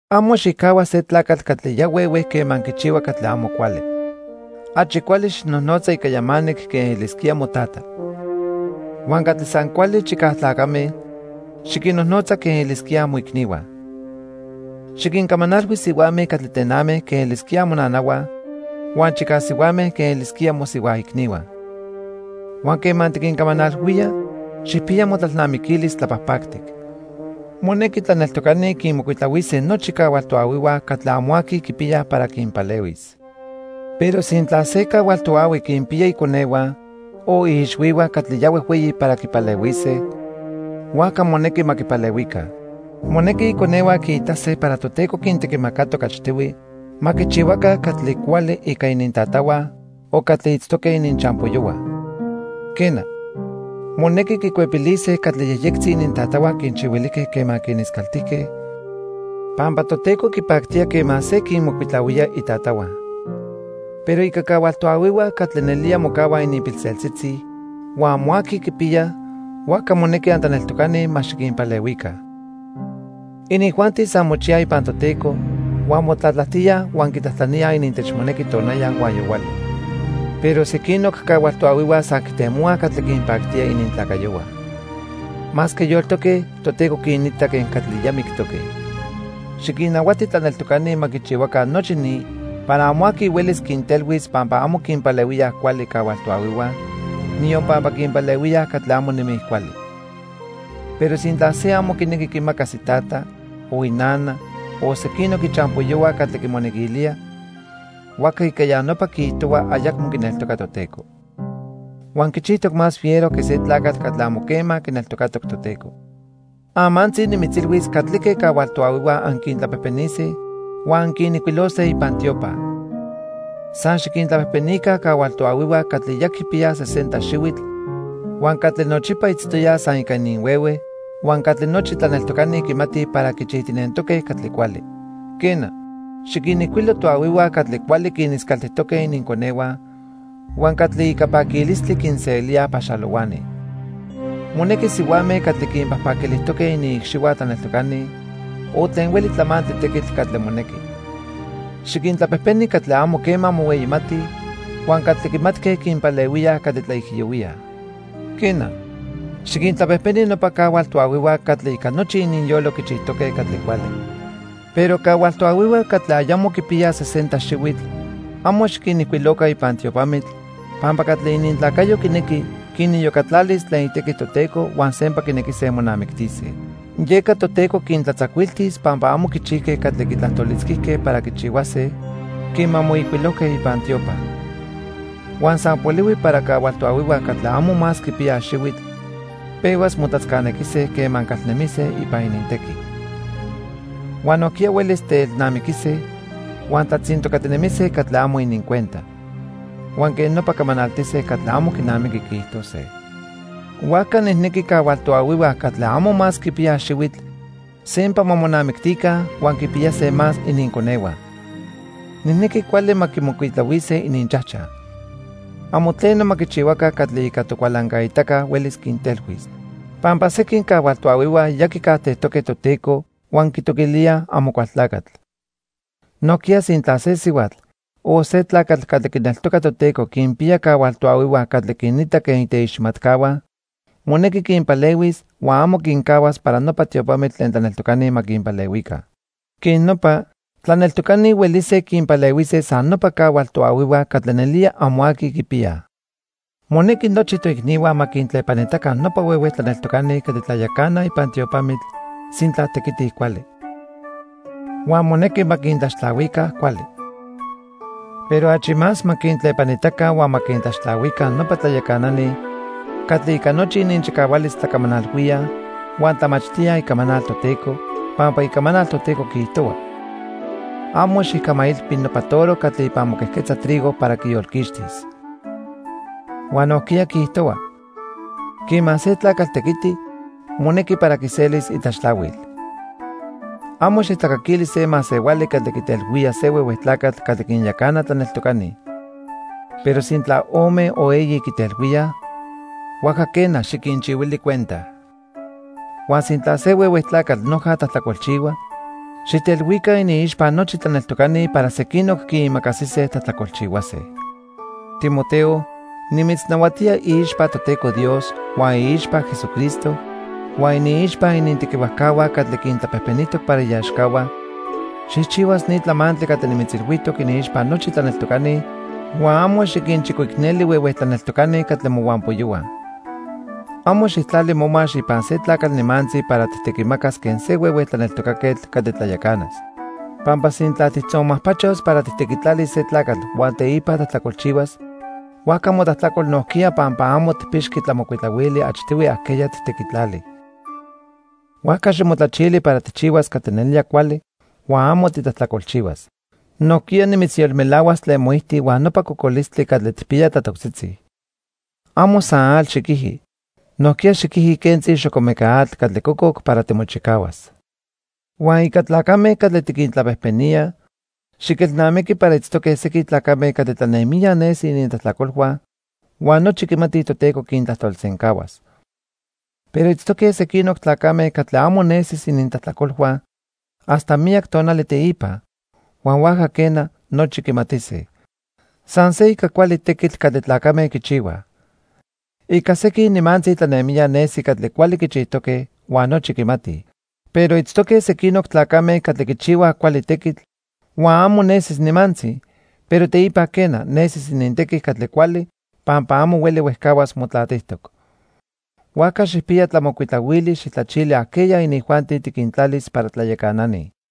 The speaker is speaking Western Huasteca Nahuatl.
Amo xicajhua se tlacatl catli ya huehue quema quichihua catli amo cuali. Achi cuali xijnojnotza ica yamanic quen elisquía motata. Huan catli san cuali chicaj tlacame, xiquinnojnotza quen elisquíaj moicnihua. Xiquincamanalhui sihuame catli tename quen elisquíaj monanahua huan chicaj sihuame quen elisquíaj mosihua icnihua. Huan quema tiquincamanalhuía, xijpiya motlalnamiquilis tlapajpactic. Monequi tlaneltocani quinmocuitlahuise nochi cahual toahuihua catli amo aqui quipiyaj para quinpalehuis. Pero sintla se cahual toahui quinpiya iconehua o iixhuihua catli ya huejhueyi para quipalehuise, huajca monequi ma quipalehuica. Monequi iconehua quiitase para Toteco quintequimacatoc achtihui ma quichihuaca catli cuali ica inintatahua o catli itztoque ininchampoyohua. Quena, monequi quicuepilise catli yejyectzi inintatahua quinchihuilijque quema quiniscaltijque, pampa Toteco quipactía quema se quinmocuitlahuía itatahua. Pero ica cahual toahuihua catli nelía mocahuaj ininpilseltzitzi huan amo aqui quipiyaj, huajca monequi antlaneltocani ma xiquinpalehuica. Inijuanti san mochiyaj ipan Toteco huan motlatlajtíaj huan quitlajtlaníaj inintechmonequi tonaya huan yohuali. Pero sequinoc cahual toahuihua san quitemohuaj catli quinpactía inintlacayohua. Masque yoltoque, Toteco quinita quen catli ya mictoque. Xiquinnahuati tlaneltocani ma quichihuaca nochi ni para amo aqui huelis quintelhuis pampa amo quinpalehuíaj cuali cahual toahuihua, niyon pampa quinpalehuíaj catli amo nemij cuali. Pero sintla se amo quinequi quimacas itata, o inana o sequinoc ichampoyohua catli quinmonequilía, huajca ica ya nopa quiijtohua ayacmo quineltoca Toteco. Huan quichijtoc más fiero que se tlacatl catli amo quema quineltocatoc Toteco. Amantzi nimitzilhuis catlique cahual toahuihua anquintlapejpenise huan anquinijcuilose ipan tiopa. San xiquintlapejpenica cahual toahuihua catli ya quipiyaj sesenta xihuitl huan catli nochipa itztoyaj san ica ininhuehue, huan catli nochi tlaneltocani quimatij para quichijtinentoque catli cuali. Quena, xiquinijcuilo toahuihua catli cuali quiniscaltijtoque ininconehua huan catli ica paquilistli quinselíaj paxalohuani. Monequi sihuame catli quinpajpaquilijtoque iniicxihua tlaneltocani o tlen hueli tlamantli tequitl catli monequi. Xiquintlapejpeni catli amo quema mohueyimatij huan catli quimatque quinpalehuíaj catli tlaijiyohuíaj. Quena, xiquintlapejpeni nopa cahual toahuihua catli ica nochi ininyolo quichijtoque catli cuali. Pero cahual toahuihua catli ayamo quipiyaj sesenta xihuitl amo xiquinijcuiloca ipan tiopamitl, pampa catli inintlacayo quinequi, quiniyocatlalis tlen itequi Toteco huan sempa quinequise monamictise. Yeca Toteco quintlatzacuiltis pampa amo quichijque catli quitlajtolitzquijque para quichihuase quema moijcuilojque ipan tiopa. Huan san polihui para cahual toahuihua catli amo más quipiyaj xihuitl pehuas motlatzcanequise quema calnemise ipan inintequi. Huan nojquiya huelis teelnamiquise huan tlatzintocatinemise catli amo inincuenta. Huan quej nopa camanaltise catli amo quinamiqui quiijtose. Huajca nijnequi cahual toahuihua catli amo más quipiyaj xihuitl sempa ma monamictica huan quipiyase más ininconehua. Nijnequi cuali ma quimocuitlahuise ininchajchaj. Amo tleno ma quichihuaca catli ica tocualancaitaca huelis quintelhuis. Pampa sequin cahual toahuihua ya quicajtejtoque Toteco huan quitoquilíaj Amocualtlacatl. Nojquiya sintla se sihuatl o se tlacatl catli quineltoca Toteco quinpiya cahual toahuihua catli quinita quen iteiximatcahua, monequi quinpalehuis huan amo quincahuas para nopa tiopamitl tlen tlaneltocani ma quinpalehuica. Quej nopa, tlaneltocani huelise quinpalehuise san nopa cahual toahuihua catli nelía amo aqui quipiyaj. Monequi nochi toicnihua ma quintlepanitaca nopa huehue tlaneltocani catli tlayacanaj ipan tiopamitl sintla tequitij cuali. Huan monequi ma quintlaxtlahuica cuali. Pero achi más ma quintlepanitaca huan ma quintlaxtlahuica nopa tlayacanani catli ica nochi ininchicahualis tlacamanalhuíaj huan tlamachtíaj Icamanal Toteco, pampa Icamanal Toteco quiijtohua: "Amo xijcamailpi nopa toro catli ipan moquejquetza trigo para quiyolquixtis." Huan nojquiya quiijtohua: "Quema se tlacatl tequiti, monequi para quiselis itlaxtlahuil." Amo xijtlacaquili se masehuali catli quitelhuía se huehue tlacatl catli quinyacana tlaneltocani. Pero sintla ome o eyi quitelhuíaj, huajca quena, xiquinchihuili cuenta. Huan sintla se huehue tlacatl noja tlajtlacolchihua, xijtelhuica iniixpa nochi tlaneltocani para sequinoc quiimacasise tlajtlacolchihuase. Timoteo, nimitznahuatía iixpa Toteco Dios, huan iixpa Jesucristo, huan iniixpa inintequihuajcahua catli quintlapejpenijtoc para iaxcahua, xijchihuas ni tlamantli catli nimitzilhuijtoc iniixpa nochi tlaneltocani huan amo xiquinchicoicneli huehue tlaneltocani catli mohuampoyohua. Amo xijtlali momax ipan se tlacatl nimantzi para tijtequimacas quen se huehue tlaneltocaquetl catli tlayacanas. Pampa sintla tijtzonmajpachos para tijtequitlalis se tlacatl huan teipa tlajtlacolchihuas, huajca motlajtlacol nojquiya pampa amo tijpixqui tlamocuitlahuili achtihui ajqueya tijtequitlali. Huajca ximotlachili para tijchihuas catli nelía cuali huan amo titlajtlacolchihuas. Nojquiya nimitzyolmelahuas tlen moijti huan nopa cocolistli catli tijpiya tlatoctzitzi. Amo san atl xiquiji, nojquiya xiquiji quentzi xocomeca atl catli cococ para timochicahuas. Huan ica tlacame catli tiquintlapejpenía, xiquelnamiqui para itztoque sequin tlacame catli tlanemijya nesi inintlajtlacolhua huan nochi quimatij Toteco quintlajtolsencahuas. Pero itztoque sequinoc tlacame catli amo nesis inintlajtlacolhua hasta miyac tonali teipa huan huajca quena, nochi quimatise. San se ica cuali tequitl catli tlacame quichihuaj. Ica sequin nimantzi tlanemijya nesi catli cuali quichijtoque huan nochi quimatij. Pero itztoque sequinoc tlacame catli quichihuaj cuali tequitl huan amo nesis nimantzi, pero teipa quena, nesis inintequi catli cuali pampa amo hueli huejcahuas motlatijtoc. Huajca xijpiya tlamocuitlahuili xijtlachili ajqueya inijuanti tiquintlalis para tlayacanani.